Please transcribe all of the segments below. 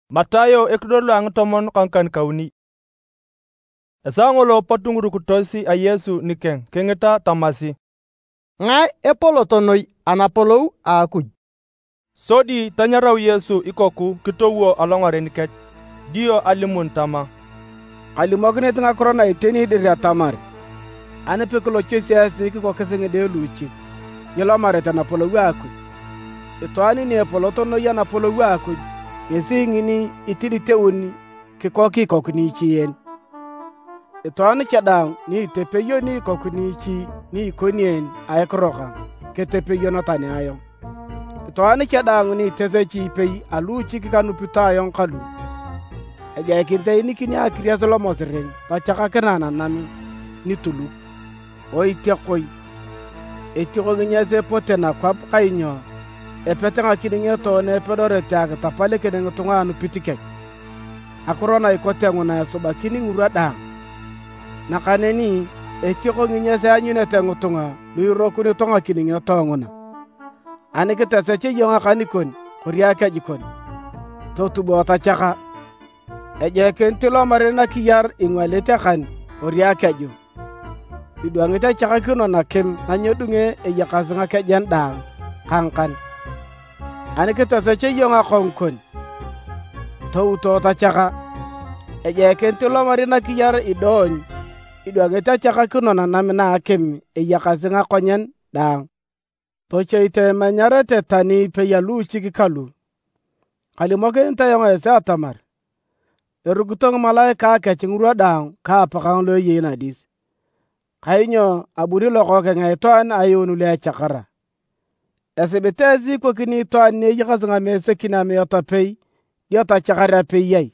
Ngae epolot noi? Esaa ngolo pot ngirukitos a Yesu nikeng kingita tamasi, “Ngae epolot noi anapolou a Akuj?” Sodi tanyarau Yesu ikoku kitowo alongaren kech, dio alimuni tama, “Kalimokinit ngakiro na iteni dir atamar ani pekilochosi esi kikokis ngide luuchik, nyilomarete napolou a Akuj. Itwaan ni epolot noi Anapolou a Akuj ngesi ngini itiditeun kikok ikoku niichi en. Itwaan cha daang ni itepeyoni ikoku niichi ni ikoni en a ekiro kang, ketepeyon tani ayong. “Itwaan cha daang ni itesechi ipei a luuchik kanupito ayong kalu, ejoikinit eenikinio akiries lomosiring tochakakinae nanam nituluk. Oitiakoi! Etioko nginyas epote nakwap kainyo epete ngakiningioto na epedorete akitapalikin ngitunga anupit kech! Ngakiro na ikote nguna esubakin ngirwa daang, nakaneni etioko nginyas eanyunete ngitunga lu irokunito ngakiningioto nguna! “Ani kitosech iyong akan kon kori akeju kon, totubo tochaka. Ejoikinit ilomari nakiyar ingwalit akan kori akeju idwangit achakakino nakim na nyedunge eyakasi ngakejen daang ka ngakan. Ani kitosech iyong akongu kon, touto tochaka. Ejoikinit ilomari nakiyar idoony idwangit achakakino nanam na akim eyakasi ngakonyen daang. “Tochoito imenyarete tani ipei a luuchik kalu. Kalimokinit ayong esi atamar, erukito ngimalaikae kech ngirwa daang ka Apakang lo eyei nadis. [ Kainyo abuni Lokookeng a Itwaan ayuun lu echakara.] “Esibit esi ikokini itwaan ni eyakasi ngamesekin amiat apei, dio tochakar apei ai?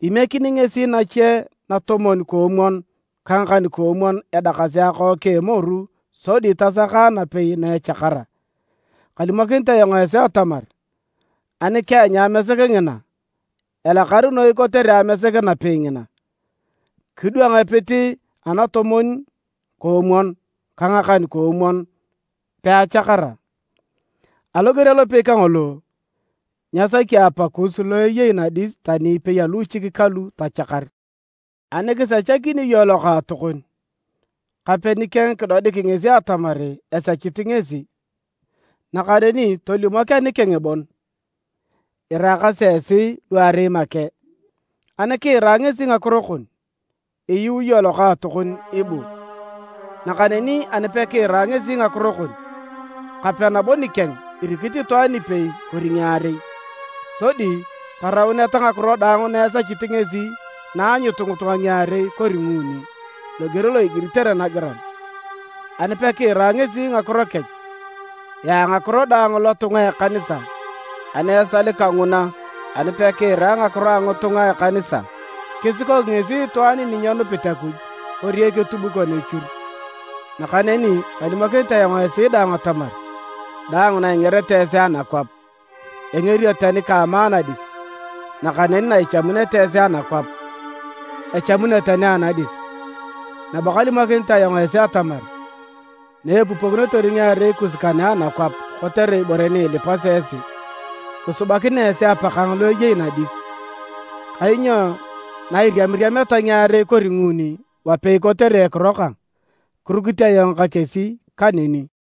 Imiekini ngesi nache natomwon-koomwon ka ngakan-koomwon edakasi akook a emoru sodi tasaka napei na echakara. Kalimokinit ayong esi atamar, ani keanyu amesek ngina, elakar noi kotere amesek napei ngina kidwang epit anatomwon-koomwon ka ngakan-koomwon peachakara. Aloger alopei kangolo, nyesaki Apakus lo eyei nadis tani ipei a luuchik kalu tochakar. “Ani kisechakini iyong lokaatokon, kape nikeng kidodik ngesi atamar esechit ngesi. Nakaneni tolimok anikeng bon, iraakasi esi luarei make. Ani kiira ngesi ngakiro kon, iyuu iyong lokaatokon ibuu. Nakaneni ani pekiira ngesi ngakiro kon, kape nabo nikeng irikit itwaan ipei kori ngiarei, sodi tarauneta ngakiro daang na esechit ngesi na aanyut ngitunga ngiarei kori nguuni, loger lo igiritere nagiran. Ani pekiira ngesi ngakiro kech, yaa ngakiro daang lotunga a ekanisa. Ani esal kanguna, ani pekiira ngakiro a ngitunga a ekanisa, kisikok ngesi itwaan ni nyenupit Akuj kori eketubukon echur. “Nakaneni kalimokinit ayong esi daang atamar: daang na ingerete esi anakwap, engerio tani ka ama anadis. Nakaneni na ichamunete esi anakwap, echamunio tani anadis. Nabo kalimokinit ayong esi atamar, na epupokinotor ngiarei kus kane anakwap kotere ibore ni ilipasi esi, kisubakinea esi Apakang lo eyei nadis. Kainyo na iriamiriameta ngiarei kori nguuni wapei kotere ekiro kang, kirukit ayong ka kesi kaneni.”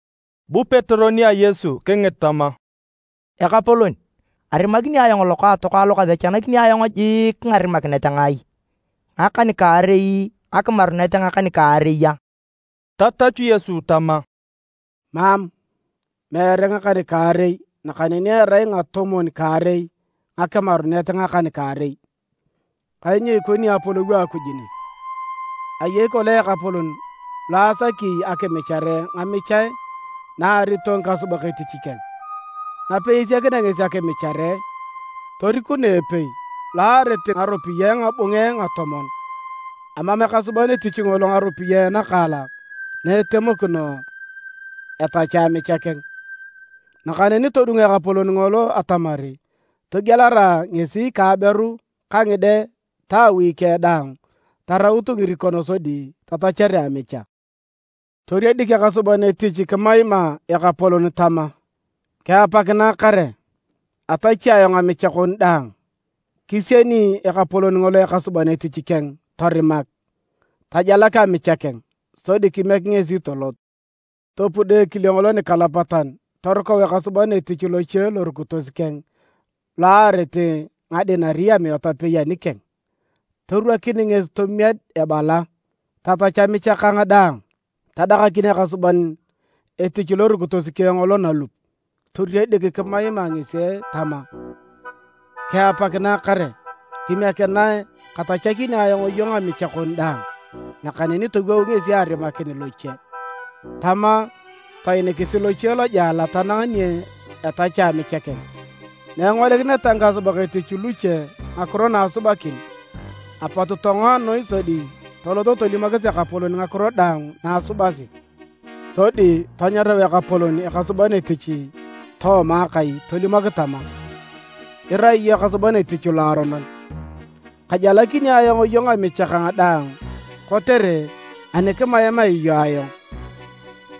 Bu Petero nia Yesu kingit tama, “Ekapolon arimakini ayong lokaatokang lo kasechanakini ayong jiik ngarimanakinet ngai? Ngakan-kaarei ngakimarunet ngakan-kaarei a?” Tatachu Yesu tama, “Mam, meere ngakan-kaarei nakaneni erai ngatomwon-kaarei ngakimarunet ngakan-kaarei. Kainyo ikoni Apolou a Akuj ne. Ayei kolong ekapolon lo asaki akimichare ngamichae na aarito ngikasubak etich keng. Napei esiakinea ngesi akimichare, torikunoe epei lo aarit ngaropiyae ngabunge ngatomon. Amam ekasuban etich ngolo ngaropiyae nakaalak na etemokino etachea amicha keng. Nakaneni todung ekapolon ngolo atamar togielarae ngesi ka aberu ka ngide ta awi keng daang taraut ngirikon sodi tatachere amicha. Toriedik ekasuban etich kimaima ekapolon tama: ‘Kiapakinae kare! Atachi ayong amicha kon daang’. Kisieni ekapolon ngolo ekasuban etich keng torimak, tajalak amicha keng, sodi kimiek ngesi tolot. “Topudo ekile ngolo nikalapatan torukau ekasuban etich loche lorukitos keng lo aarit ngadinari amiat apei anikeng. Torwakin ngesi tomied ebala, ‘Tatach amicha kang daang’. Tadakakin ekasuban etich lorukitos keng ngolo nalup toriedik kimaima ngesi tama, ‘Kiapakinae kare. Kimiekinae katachakini ayong iyong amicha kon daang’. Nakaneni towou ngesi arimakin loche, tama toinikisi loche lojela tanang ni etachea amicha keng. Na engolikineta ngikasubak etich luche ngakiro na asubakin, apot tongoa noi sodi toloto tolimokis ekapolon ngakiro daang na asubasi. Sodi tanyarau ekapolon ekasuban etich tooma akai tolimok tama, ‘Irai iyong ekasuban etich loaronon, kajalakini ayong iyong amicha kang daang kotere ani kimaimaea iyong ayong.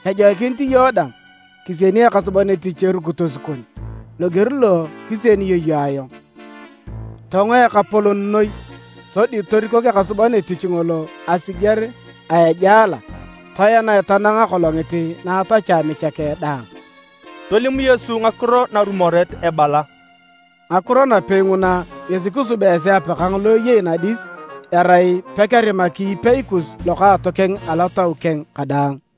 Ejoikinit iyong dang kisieni ekasuban etich erukitos kon loger lo kisienio iyong ayong.’ Tongo ekapolon noi sodi torikok ekasuban etich ngolo asiger a ejela toenae tanang akolongit na etachea amicha keng daang.” Tolim Yesu ngakiro narumoret ebala, “Ngakiro napei nguna ngesi kisubea esi Apakang lo eyei nadis erai pekerimaki ipeikus lokaatokeng alotau keng kadaang.”